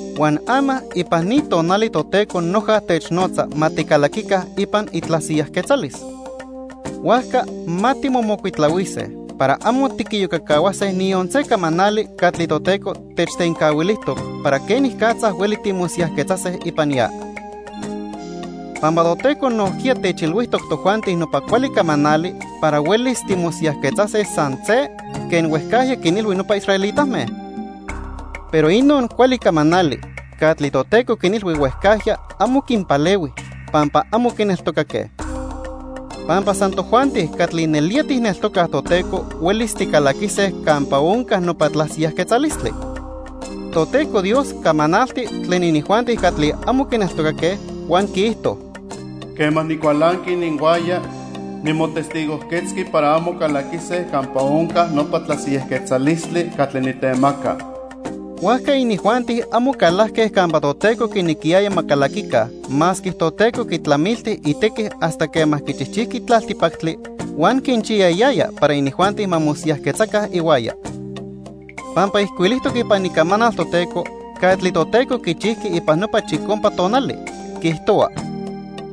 Huan ama ipan ni tonali Toteco noja technotza ma ticalaquica ipan itlasiyajquetzalis. Huajca ma timomocuitlahuise para amo tiquiyocacahuase niyon se camanali catli Toteco techtencahuilijtoc para quenicatza hueli timosiyajquetzase ipan ya. Pampa Toteco nojquiya techilhuijtoc tojuanti nopa cuali camanali para huelis timosiyajquetzase san se quen huejcajya quinilhui nopa israelitame. Pero inon cuali camanali catli Toteco quinilhui huejcajya amo quinpalehui, pampa amo quineltocaque. Pampa san tojuanti catli nelía tijneltocaj Toteco huelis ticalaquise campa onca nopa tlasiyajquetzalistli. Toteco Dios camanalti tlen inijuanti catli amo quineltocaque huan quiijto: "Quema nicualanqui ininhuaya, nimotestigojquetzqui para amo calaquise campa onca nopa tlasiyajquetzalistli catli nitemaca." Huajca inijuanti amo calajque campa Toteco quinequiyaya ma calaquica masque Toteco quitlamilti itequi hasta quema quichijchijqui tlaltipactli huan quinchiyayaya para inijuanti ma mosiyajquetzaca ihuaya. Pampa ijcuilijtoc ipan Icamanal Toteco catli Toteco quichijqui ipan nopa chicompa tonali, quiijtohua: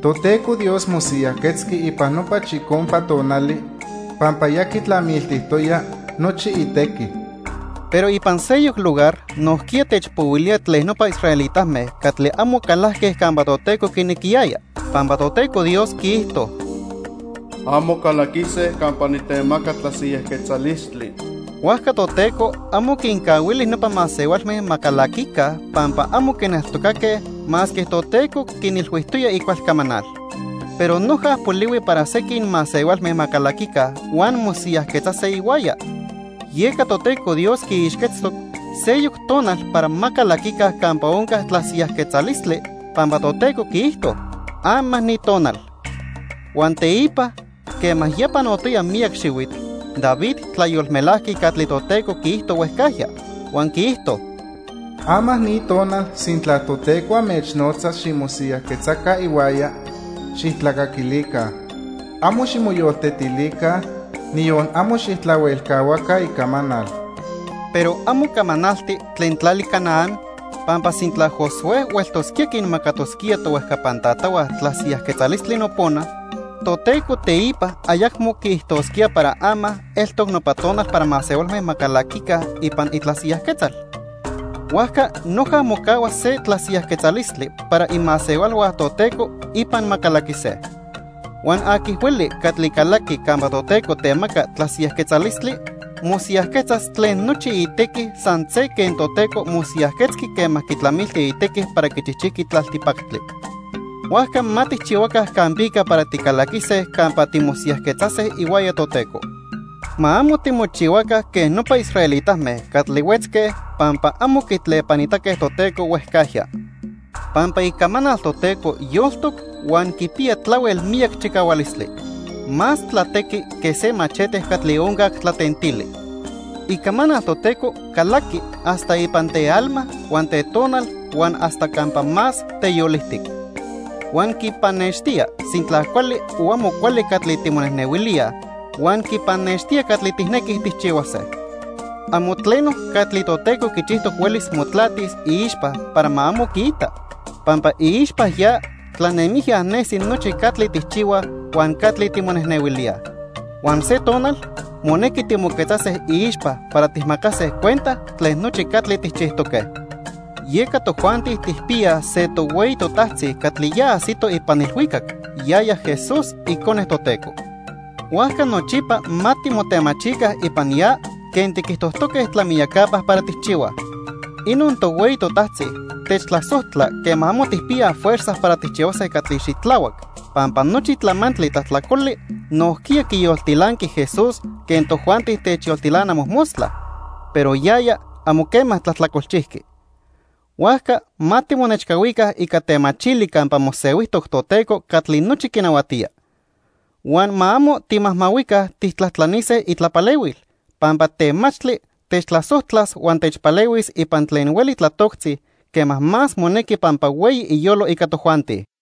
"Toteco Dios mosiyajquetzqui ipan nopa chicompa tonali pampa ya quitlamiltijtoya nochi itequi." Pero ipan seyoc lugar nojquiya techpohuilía tlen nopa israelitame catli amo calajque campa Toteco quinequiyaya, pampa Toteco Dios quiijto: "Amo calaquise campa nitemaca tlasiyajquetzalistli." Huajca Toteco amo quincahuili nopa masehualme ma calaquica pampa amo quineltocaque masque Toteco quinilhuijtoya icual camanal. Pero noja polihui para sequin masehualme ma calaquica huan mosiyajquetzase ihuaya. Yeca Toteco Dios quiixquetztoc seyoc tonal para ma calaquica campa onca tlasiyajquetzalistli, pampa Toteco quiijto: "Ama ni tonal." Huan teipa quema ya panotoya miyac xihuitl, David tlayolmelajqui catli Toteco quiijto huejcajya, huan quiijto: "Ama ni tonal, sintla Toteco anmechnotzas ximosiyajquetzaca ihuaya, xijtlacaquilica. Amo ximoyoltetilica, niyon amo xijtlahuelcahuaca icamanal." Pero amo camanalti tlen tlali Canaán, pampa sintla Josué hueltosquía quinmacatosquía tohuejcapan tatahua tlasiyajquetzalistli nopona, Toteco teipa ayacmo quiijtosquía para ama eltoc nopa tonal para masehualme ma calaquica ipan itlasiyajquetzal. Huajca noja mocahua se tlasiyajquetzalistli para imasehualhua Toteco ipan ma calaquise. Huan aqui hueli catli calaqui campa Toteco temaca tlasiyajquetzalistli, mosiyajquetzas tlen nochi itequi san se quen Toteco mosiyajquetzqui quema quitlamilti itequi para quichijchijqui tlaltipactli. Huajca ma tijchihuaca campica para ticalaquise campa timosiyajquetzase ihuaya Toteco. Ma amo timochihuaca quen nopa israelitame catli huetzque pampa amo quitlepanitaque Toteco huejcajya. Pampa Icamanal Toteco yoltoc huan quipiya tlahuel miyac chicahualistli. Más tlatequi que se machete catli oncac tlatentili. Icamanal Toteco calaqui hasta ipan tealma huan tetonal huan hasta campa más teyolijtic. Huan quipannextía sintla cuali o amo cuali catli timonejnehuilíaj huan quipannextía catli tijnequij tijchihuase. Amo tleno catli Toteco quichijtoc huelis motlatis iixpa para ma amo quiita, pampa iixpa ya tlanemijya nesi nochi catli tijchihuaj huan catli timonejnehuilíaj. Huan se tonal monequi timoquetzase iixpa para tijmacase cuenta tlen nochi catli tijchijtoque. Yeca tojuanti tijpiyaj se tohueyi totajtzi catli ya ajsito ipan ilhuicac, yaya Jesús, Icone Toteco. Huajca nochipa ma timotemachica ipan ya quen tiquijtojtoque tlamiyacapa para tijchihuaj. Inon tohueyi totajtzi techtlasojtla quema amo tijpiyaj fuerza para tijchihuase catli xitlahuac, pampa nochi tlamantli tlajtlacoli nojquiya quiyoltilanqui Jesús quen tojuanti techyoltilana mojmostla, pero yaya amo quema tlajtlacolchijqui. Huajca ma timonechcahuica ica temachili campa mosehuijtoc Toteco catli nochi quinahuatía. Huan ma amo timajmahuica tijtlajtlanise itlapalehuil, pampa temachtli techtlasojtlas huan techpalehuis ipan tlen hueli tlatoctzi quema más monequi pampa hueyi iyolo ica tojuanti.